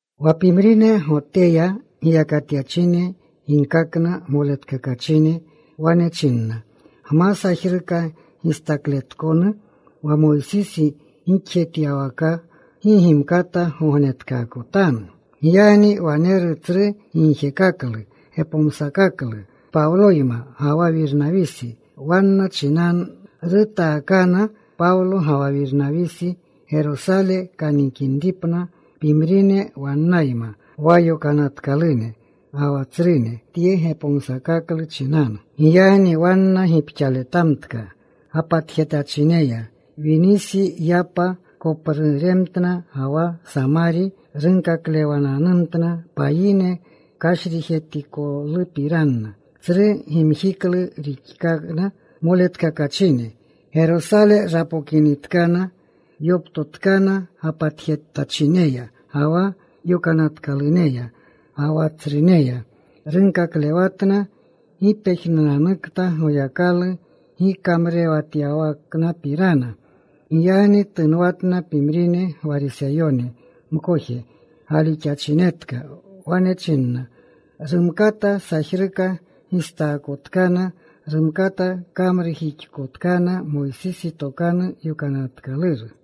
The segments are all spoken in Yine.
Wa pimrine Goteya giyakatyachine ginkakna moletkakachine. Wane chinna, “Gma sajruka gistakletkonu wa Moysisi gixjixlewatyawaka, gi gimkata gognetkaakotanu.” Giyagni waneru tsru gigjekaklu, gepomsakaklu Pawloyma ga wa Wirnawisi wanna chinanu. Rutaakana Pawlo ga wa Wirnawisi Gerosale kanikinripna, pimrine wannayma, wa yokanatkalune ga wa tsrune yegi tye gepomsakaklu chinanu. Giyagni wanna gipxaletamtka gapatjetachineya. Winisi yapa kopruremtna ga wa Samari. Runkaklewananumtna payine kashrijetikolupirana. Tsru gimjiklu rixkakna moletkakachine. Gerosale rapokinitkana, yoptotkana gapatjetachineya ga wa yokanatkaluneya, ga wa tsruneya. Runkaklewatna gi pejnunanukta Goyakalu gikamrurewatyawaknapirana. Giyagni tunwatna pimrine Gwariseyone mkoje galixachinetka. Wane chinna, “Rumkata sajruka gistaakotkana. Rumkata kamrujixkotkana Moysisi Tokanu Yokanatkaluru.”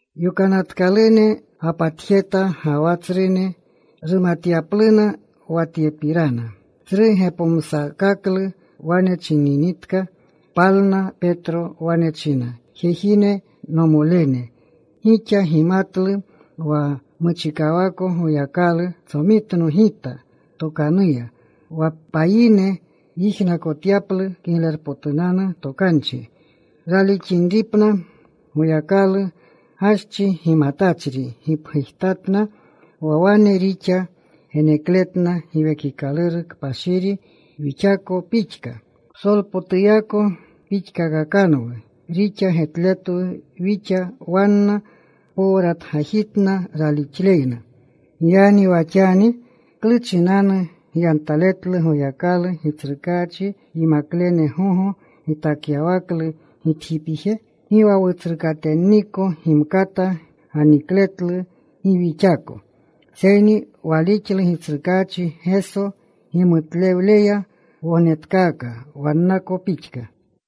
Yokanatkalune gapatjeta ga wa tsrune rumatyapluna wa tyepirana. Tsru gepomsakaklu wane chininitka, palna Petro. Wane chinna, “Jejine, nomolene, gixa gimatlu wa muchikawako Goyakalu tsomitno gita tokanuya wa payine yijnakotyaplu Kiglerpotunanu Tokanchi, ralixinripna. Goyakalu gaschi gimatachri gipgujtatna, wa wane rixa genekletna Giwekikaluru Kpashiri wixako pixka. Psolpotuyako pixkakakanwu rixa getletwu wixa, wanna. Powratgajitna ralixleyna. Giyagni wa xani ¿klu chinanu gyantaletlu Goyakalu, Gitsrukaachi yimaklene gogo gitakyawaklu gitjipije? Gi wa wutsrukatenniko gimkata ganikletlu, gi wixako. Seyni walixlu Gitsrukaachi Geso gimutlewleya wognetkaaka wannako pixka.”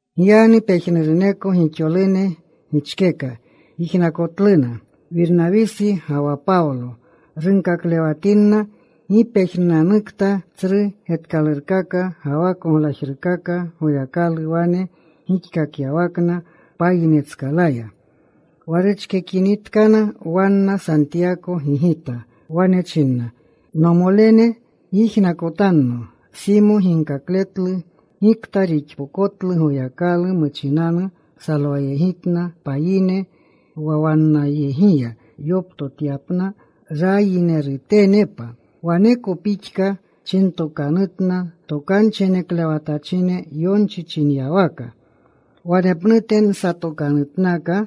Giyagni pejnuruneko gixolune gichkeka. Yijnakotluna Wirnawisi ga wa Pawlo runkaklewatinna gi pejnunanukta tsru getkalurkaka ga wa koglajrukaka Goyakalu wane gixkakyawakna payinetskalaya. Wa ruchkekinitkana wanna, Santiyako gigita. Wane china, “Nomolene, gyijnakotanno. Simo ginkakletlu gikta rixpokotlu Goyakalu. Muchinanu salwayegitna payine, wa wannayegiya yoptotyapna rayinerutenepa. Waneko pixka chintokanutna tokanchi geneklewatachine, yonchi chinyawaka: Wanepnute nsatokanutnaka.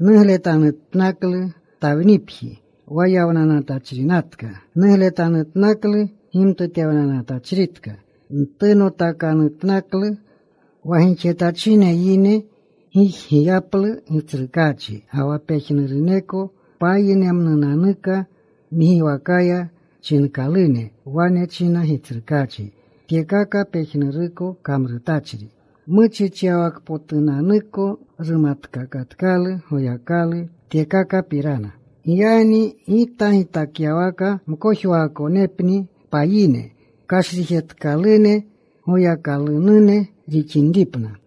Nugletanutnaklu Tawnipji, wa yawnachrinatka. Nugletanutnaklu gimtutewnachritka. Ntunotakanutnaklu. Wa gixetachine yine gijgiyaplu Gitsrukaachi, ga wa pejnuruneko payinemnunanuka, ngiwakaya chinkalune. Wane china Gitsrukaachi tyekaka pejnuruko kamrutachri. Muchichyawakpotunanuko rumatkakatkalu Goyakalu tyekakapirana. “Giyagni gita gitakyawaka mkojwaakonepni payine kashrijetkalune Goyakalunune rixinripna.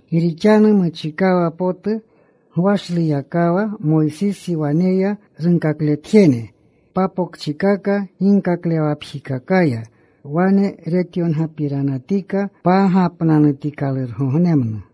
Gi rixanu muchikawa potu gwashluyakawa Moysisi waneya runkakletjene papokchikaka ginkaklewawakapjikakaya. Wane retyongapiranatika pagapnanutikalurgognemnu.”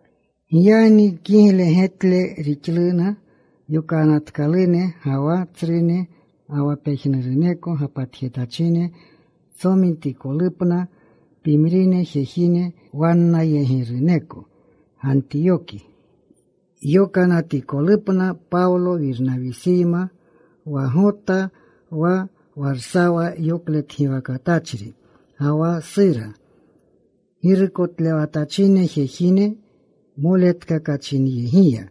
Giyagni kigle getle rixluna yokanatkalune, ga wa tsrune, ga wa pejnuruneko gapatjetachine tsomitikolupna pimrine jejine wannayegiruneko, Gantiyoki yokanatikolupna Pawlo Wirnawisiyma, wa Gota, wa Warsawa yokletgiwakatachri, ga wa Sura girukotlewatachine jejine moletkakachinyegiya.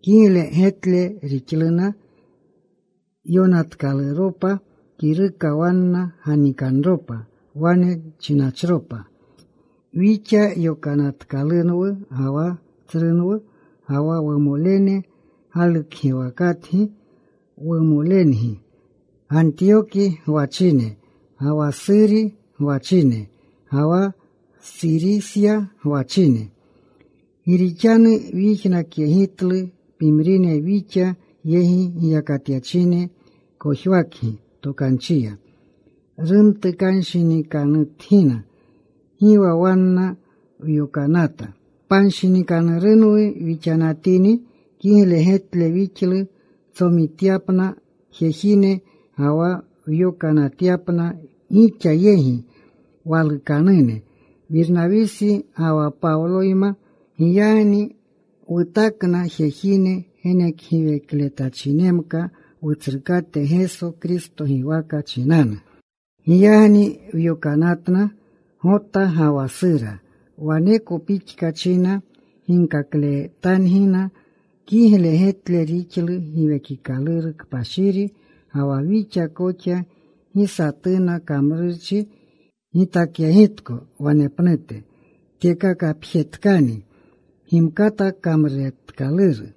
Kigle getle rixluna yonatkaluropa kiruka wanna ganikanropa. Wane chinachropa: “Wixa yokanatkalunwu ga wa tsrunwu, ga wa wumolene galukgiwakatgi, wumolengi, Gantiyoki gwachine, ga wa Suri gwachine, ga wa Surisya gwachine. Gi rixanu wyijnakyegitlu pimrine wixa yegi giyakatyachine kojwakgi tokanchiya. Rumtukanshinikanutgina. Gi wa wanna wyokanata. Panshinikanurunwu wixanatini kigle getle wixlu wtsomitkapna jejine ga wa wyokanatyapna gixa yegi: walukanune Wirnawisi ga wa Pawloyma. Giyagni wutakna jejine genekgiwekletachinemka Wutsrukate Geso Kristo giwaka chinanu. Giyagni wyokanatna Gota ga wa Sura. Waneko pixka china ginkakletangina. Kigle getle rixlu Giwekikaluru Kpashiri ga wa wixa koxa gi satuna kamrurchi gitakyegitko wanepnute. Tyekakapjetkani gimkata kamrutkaluru: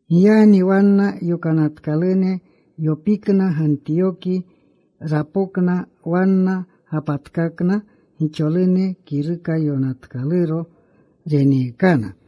Giyagni wanna yokanatkalune yopikna. Gantiyoki rapokna. Wanna gapatkakna gixolune. Kiruka yonatkaluro reneekana.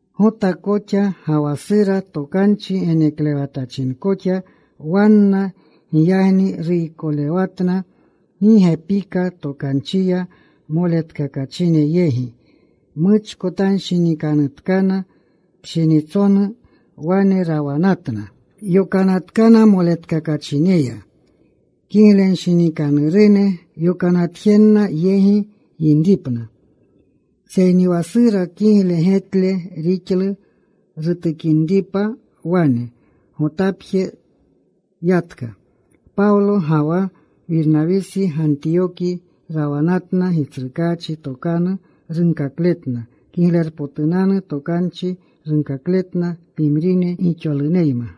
Gota koxa ga wa Sura tokanchi geneklewatachinkoxna wanna. Giyagni ruykolewatna gi gepika tokanchiya moletkakachine yegi. Muchkotanshinikanutkana. Pshinitsonu wane rawamtna. Yokanatkana moletkakachineya kiglenshinikanurune, yokanatjenna yegi yinripna. Seyni wa Sura kigle getle rixlu rutukinripa wane. Gotapje yatka. Pawlo ga wa Wirnawisi Gantiyoki rawanatna. Gitsrukaachi tokanu runkakletna. Kiglerpotunanu Tokanchi runkakletna pimrine gixoluneyma.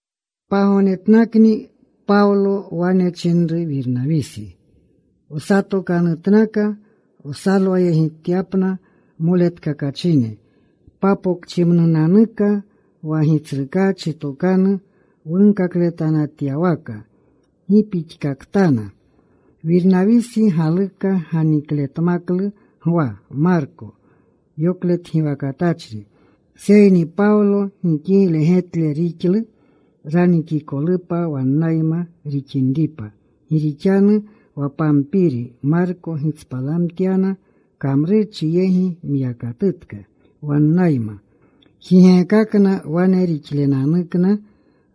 Pagognetnakni Pawlo wane chinru Wirnawisi, “Wsatokanutnaka wsalwayegityapna moletkakachine papokchimnunanuka wa Gitsrukaachi tokanu wunkakletanatyawaka, gi pixkaktana.” Wirnawisi galuka ganikletmaklu Gwa, Marko yokletgiwakatachri. Seyni Pawlo gi kigle getle rixlu ranikikolupa wannayma rixinripa gi rixanu wa Pampiri Marko gitspalamtyana; kamrurchi yegi myakatutka wannayma. Jigeekakna. Wane rixlenanukna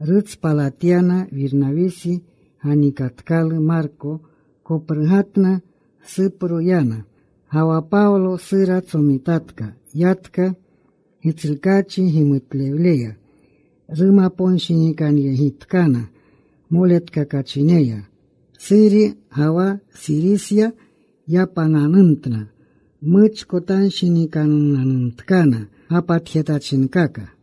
rutspalkakyana. Wirnawisi ganikatkalu Marko. Koprugatna. Supro yana. Ga wa Pawlo Sura tsomitatka. Yatka. Gitsrukaachi gimutlewleya rumaponshinikanyegitkana moletkakachineya. Suri ga wa Surisya yapananumtna. Muchkotanshinikanunanumtkana gapatjetachinkaka.